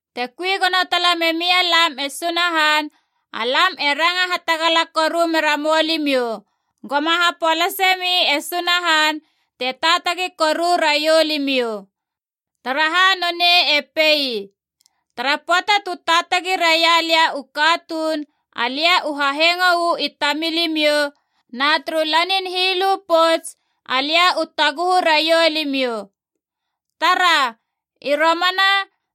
Te kui gono tala memia lam e Sunahan, alam e ranga hatagala koru mera moulimiou, goma hapolase mi e Sunahan te taatagi koru raiou limiou. Taraha nonei e pei, “Tara pöata tu taatagi raia lia u katuun, alia u hahengo uu i tamilimiou, na turu lanin hilu pouts, alia u taguhu raiou limiou.” Tara, i romana,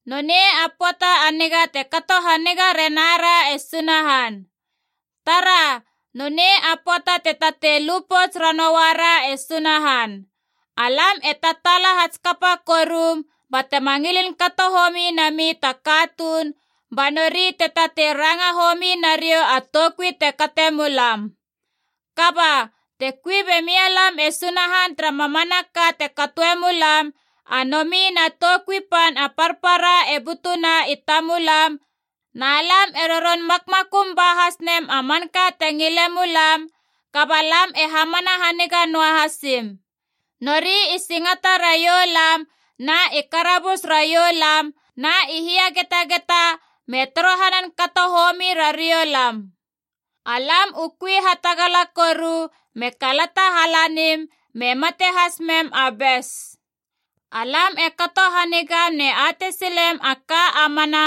nonei a pöata a niga te kato haniga renara e Sunahan. Tara, nonei a pöata te tatei lu pouts ranouara e Sunahan. Alam e tataala hatskapa korum batema ngilin kato homi nami ta katuun ba nori te tatei ranga homi nariou a toukui te kate mulam. Kaba, te kui be mialam e Sunahan tara mamanaka te katoe mulam, a nomi na toukui pan a parpara e butuna i tamulam na lam e roron makmakum ba has nem a manka te ngile mulam, kaba lam e hamana haniga noa hasim. Nori i singata raiou lam, na i karabus raiou lam, na i hiagetageta me torohanan kato homi rariou lam. Alam u kui hatagala koru me kalata halanim me mate has mem a bes. Alam e kato hanigam ne atei silem a ka a mana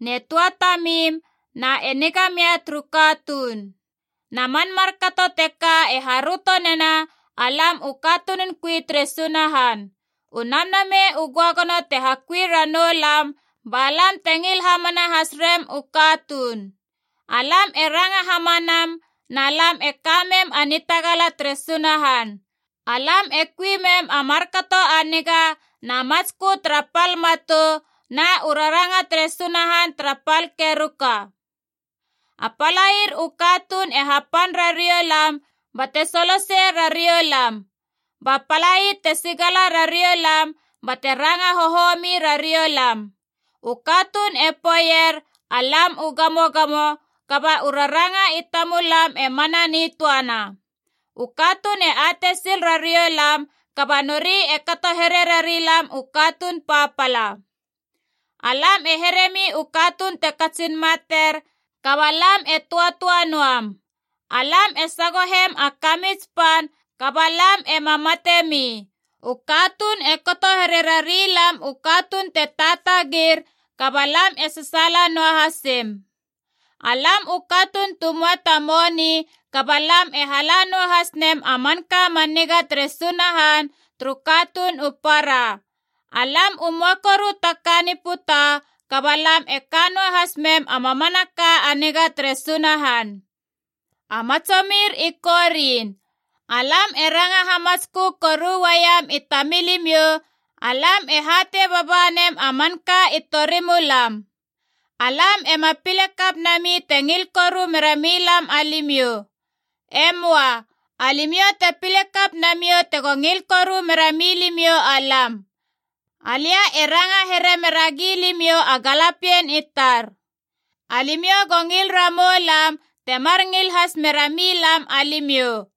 ne tuatamim na e niga mia turu katuun. Na man markato teka e haröto nena alam u katunun kui tere Sunahan. U Namnamei u Göagono te hakui ranou lam ba lam te ngil hamana has rem u katuun. Alam e ranga hamanam na lam e ka mem a nitagala tere Sunahan. Alam e kui mem a markato a niga na matskö tara pal matou na u raranga tere Sunahan tara pal keruka. A palair u katuun e hapan rariou lam bate solosei rariou lam. Ba palai te sigala rariou lam bate ranga hohomi rariou lam. U katuun e poeier alam u gamogamo, kaba u raranga i tamulam e mana nitöana. U katuun e atei sil rariou lam, kaba nori e kato here rari lam u katuun papala. Alam e heremi u katuun te katsin mater kaba lam e töatöa noam. Alam e sagohem a kamits pan kaba lam ema matemi. U katuun e kato here rari lam u katuun te taatagir, kaba lam e sasaala noa hasim. Alam u katuun tu möa ta moni, kaba lam e hala noa has nem a manka man niga tere Sunahan turu katuun u para. Alam u möa koru ta ka ni puta, kaba lam e ka noa has mem a mamanaka a niga tere Sunahan. A matsomir i Korin, alam e ranga hamatskö koru uaiem i tamilimiou, alam e hatei baba nem a manka i torimulam. Alam ema pile kap nami te ngil koru mera milam alimiou. E möa. Alimiou te pile kap namiou tego ngil koru mera milimiou alam. Alia e ranga here mera gilimiou a galapien i tar. Alimiou go ngil ramou lam temar ngil has mera milam alimiou.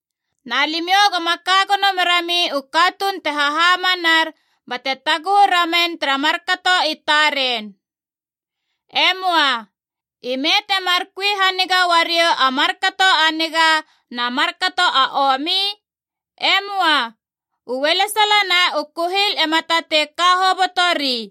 Na limiou goma ka gono merami u katuun te hahamanar bate taguhu ramen tara markato i taren. E möa. Ime temar kui haniga uariou a markato a niga na markato a omi? E möa. U ualesala na u kuhil ema tatei ka hobotori.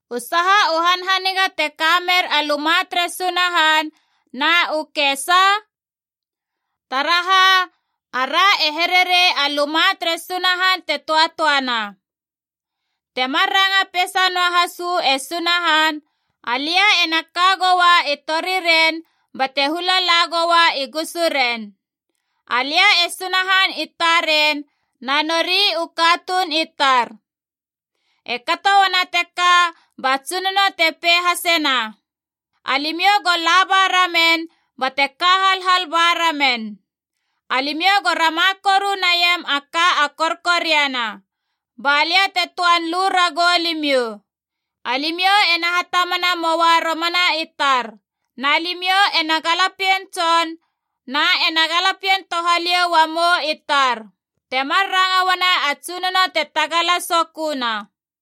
U saha u hanhaniga te kamer a luma tere Sunahan na u kesa? Taraha, ara e here rei a Luma tere Sunahan te töatöana. Te mar ranga peisa noa has uu e Sunahan, “Alia ena ka goua i toriren bate hula la goua i gusuren. Alia e Sunahan i taren na nori u katuun i tar.” E kato uana teka ba Tsunono te pei hasena, “Alimiou go laba ramen bate ka halhal ba ramen. Alimiou go rama koru naiam a ka a korkoriana, balia te töan lu ragou limiou.” “Alimiou ena hatamana moua romana i tar, na limiou ena galapien tson, na ena galapien touhaliou uamou i tar. Temar ranga uana a Tsunono te tagala soköna.”